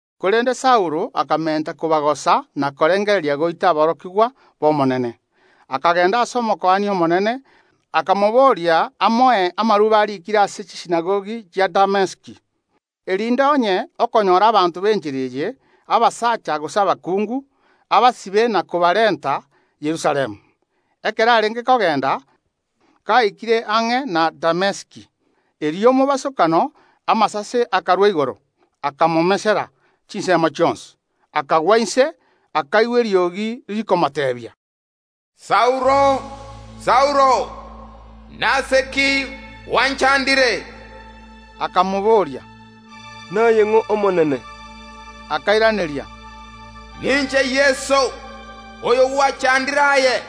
Korende ase chingaki echio Saulo akamenta kobagosa na korengereria goita aborokigwa bw’Omonene. Akagenda ase Omokuani omonene, akamobooria amoe amarube ariikire ase chisinagogi chia Damesiki, erinde onye okonyora abanto b’Enchera eye, abasacha gose abakungu, abasibe na kobarenta Yerusalemu. Ekero arenge kogenda, gaikire ang’e na Damesiki, erio mobasokano amasase akarwa igoro, akamomesera korwa chinsemo chionsi. Akagwa inse, akaigwa eriogi rikomoteebia: “Saulo, Saulo, nase ki ogonchanda iga?” Akamoboria: “Naye ng’o Omonene?” Akairaneria: “Ninche Yeso, oyo gwachandire aye,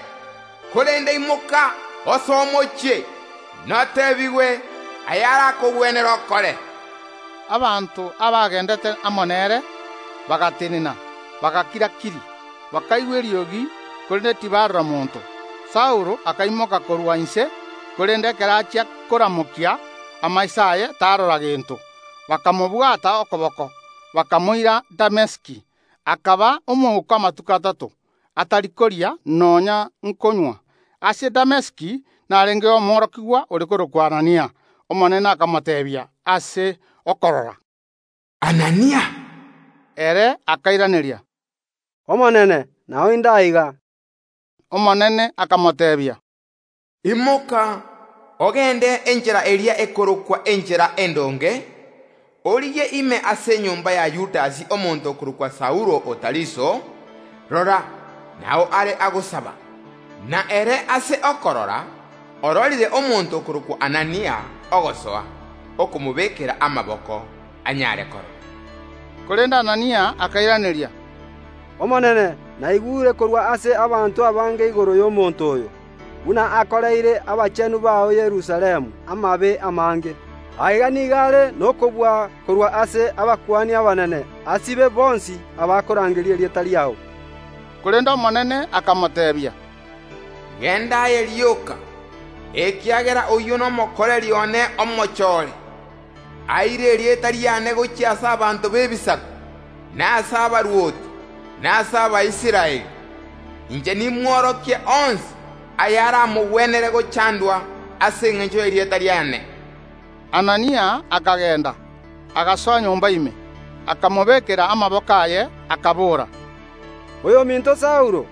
korende imoka osoe omochie, noteebigwe ayarakogwenere okore.” Abanto abagendete amo nere bagatenena, bagakira‐kiri; bakaigwa eriogi, korende tibarora monto. Saulo akaimoka korwa inse, korende ekero achia koramokia amaiso aye tarora gento. Bakamobwata okoboko, bakamoira Damesiki. Akaba omouko amatuko atato, atari koria, nonya nkonywa. Ase Damesiki narengeo omworokigwa ore korokwa Anania. Omonene akamoteebia ase chindoto: “Anania!” Ere akairaneria: “Omonene nao inde aiga.” Omonene akamoteebia: “Imoka ogende enchera eria Endonge, origie ime ase enyomba ya Yudasi omonto okorokwa Saulo o Tariso; rora, nao are agosaba. Na ere ase okorora ororire omonto okorokwa Anania ogosoa, okomobekera amaboko, anyare korora.” Korende Anania akairaneria: “Omonene, naigure korwa ase abanto abange igoro y’omonto oyo, buna akoreire abachenu bao Yerusalemu amabe amange. Aiga nigo are nokobua korwa ase abakuani abanene asibe abanto bonsi baria bakorangeria erieta riao.” Korende Omonene akamoteebia: “Genda aye rioka, ekiagera oyio nomokoreri one omochore, aire erieta riane gochia ase abanto b’Ebisaku, na ase abarwoti, na ase Abaisraeli. Inche nimworokie onsi ayaramogwenere gochandwa ase engencho y’erieta riane.” Anania akagenda, agasoa nyomba ime. Akamobekera amaboko aye, akabora: “Oyominto Saulo,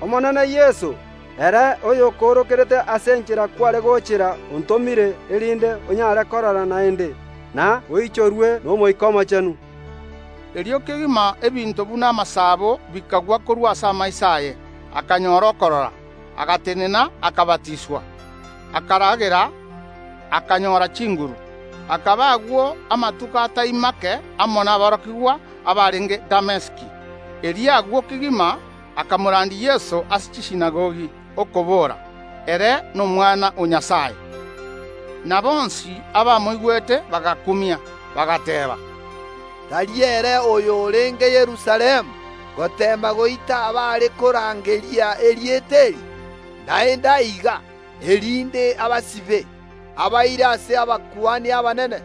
Omonene Yeso, ere oyokoorokerete ase enchera kware gochera, ontomire, erinde onyare korora naende, na oichorwe n’Omoika Omochenu.” Erio kegima ebinto buna amasabo bikagwa korwa ase amaiso aye, akanyora okorora, agatenena, akabatiswa, akaragera, akanyora chinguru. Akaba agwo amatuko atari make amo naborokigwa abarenge Damesiki. Erio agwo kegima akamorandia Yeso ase chisinagogi, okobora: “Ere n’Omwana o Nyasae.” Na bonsi abamoigwete bagakumia, bagateeba: “Tari ere oyo orenge Yerusalemu goteema goita abare korangeria erieta eri? Naende aiga, erinde abasibe, abaire ase abakuani abanene?”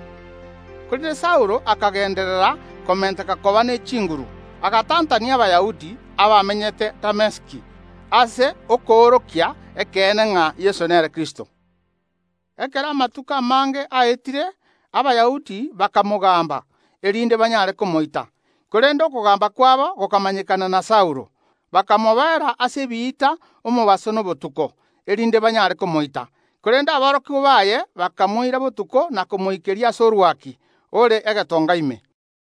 Korende Saulo akagenderera komenteka koba ne chinguru, agatantania Abayahudi abamenyete Damesiki, ase okoorokia ekeene ng’a Yeso nere Kristo. Ekero amatuko amange aetire, Abayahudi bakamogamba, erinde banyare komoita, korende okogamba kwabo gokamanyekana na Saulo. Bakamoboera ase ebiita omobaso na obotuko, erinde banyare komoita. Korende aborokigwa baye bakamoira botuko na komoikeria ase orwaki, ore egetonga ime.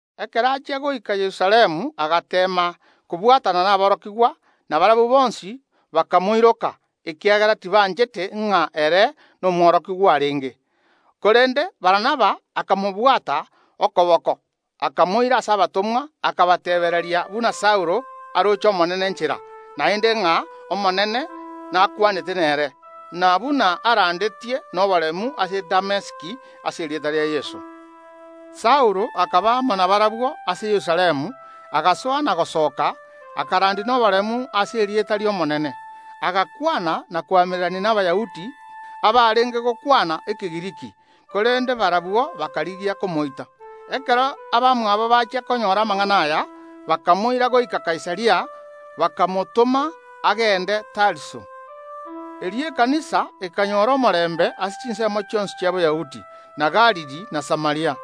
Ekero achia goika Yerusalemu agateema kobwatana naborokigwa; na barabwo bonsi bakamoiroka, ekiagera tibanchete ng’a ere nomworokigwa arenge. Korende Barnaba akamobwata okoboko, akamoira ase abatomwa, akabateebereria buna Saulo aroche Omonene nchera, naende ng’a Omonene nakwanete nere, na buna arandetie noboremu ase Damesiki ase erieta ria Yeso. Saulo akaba amo nabarabwo ase Yerusalemu, agasoa na gosoka, akarandia noboremu ase erieta ri’Omonene. Agakwana na koamererania n’Abayahudi abarenge gokwana Ekegiriki, korende barabwo bakarigia komoita. Ekero abamwabo bachia konyora amang’ana aya, bakamoira goika Kaisaria, bakamotoma agende Tariso. Erio ekanisa ekanyora omorembe ase chinsemo chionsi chia Boyahudi, na Galili, na Samaria.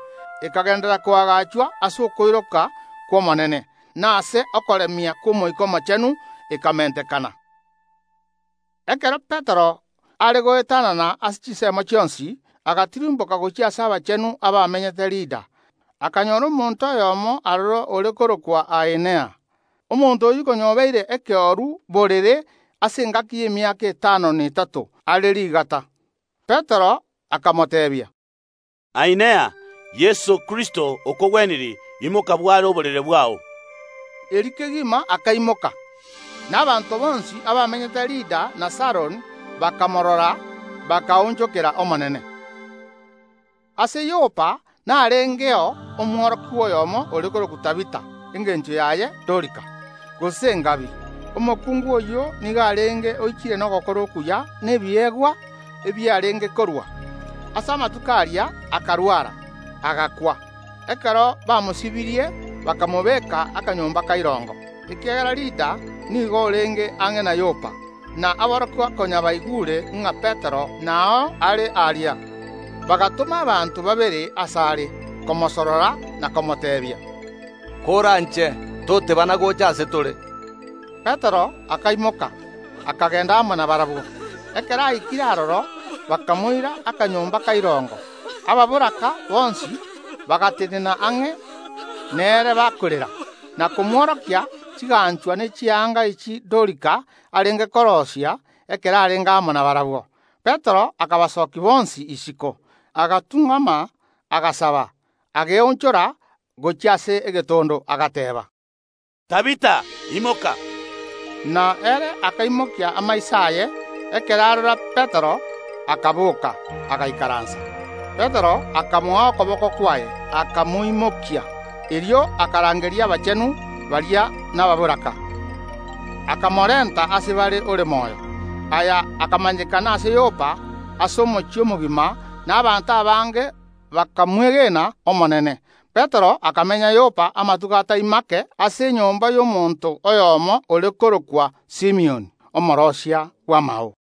Ekagenderera koagachwa ase okoiroka kw’Omonene, na ase okoremia kw’Omoika Omochenu ekamentekana. Ekero Petero are goetanana ase chinsemo chionsi, agatirimboka gochia ase abachenu abamenyete Lida. Akanyora omonto oyomo aroro ore korokwa Ainea. Omonto oyio konya obeire ekeoru borere ase engaki y’emiaka etano na etato, are rigata. Petero akamoteebia: “Ainea, Yeso Kristo okogwenirie; imoka bware oborere bwao!” Erio kegima akaimoka. Na abanto bonsi abamenyete Lida na Saroni bakamorora, bakaonchokera Omonene. Ase Yopa narengeo omworokigwa oyomo ore korokwa Tabitha, engencho yaye Dorika, gose Engabi. Omokungu oyio nigo arenge oichire nogokora okuya na ebiegwa ebi arenge korua. Ase amatuko aria akarwara, agakwa. Ekero bamosibirie bakamobeka akanyomba ka irongo. Ekiagera Lida nigo orenge ang’e na Yopa, na aborokigwa konya baigure ng’a Petero nao are aria, bagatoma abanto babere asare komosorora na komoteebia: “Koranche, totebana gocha ase tore.” Petero akaimoka, akagenda amo nabarabwo. Ekero aikire aroro, bakamoira akanyomba ka irongo. Ababoraka bonsi bagatenena ang’e nere bakorera, na komworokia chiganchwa ne chianga echi Dorika arenge koroisia ekero arenge amo nabarabwo. Petero akabasokia bonsi isiko, agatung’ama, agasaba. Akeonchora gochia ase egetondo, agateeba: “Tabitha, imoka!” Na ere akaramokia amaiso aye; ekero arora Petero, akaboka, agaikaransa. Petero akamoa okoboko kwaye, akamoimokia. Erio akarangeria abachenu baria na ababoraka, akamorenta ase bare ore moyo. Aya akamanyekana ase Yopa, ase omochie omogima, na abanto abange bakamwege n’Omonene. Petero akamenya Yopa amatuko atai make ase enyomba y’omonto oyomo ore korokwa Simioni, omooroisia bw’amao.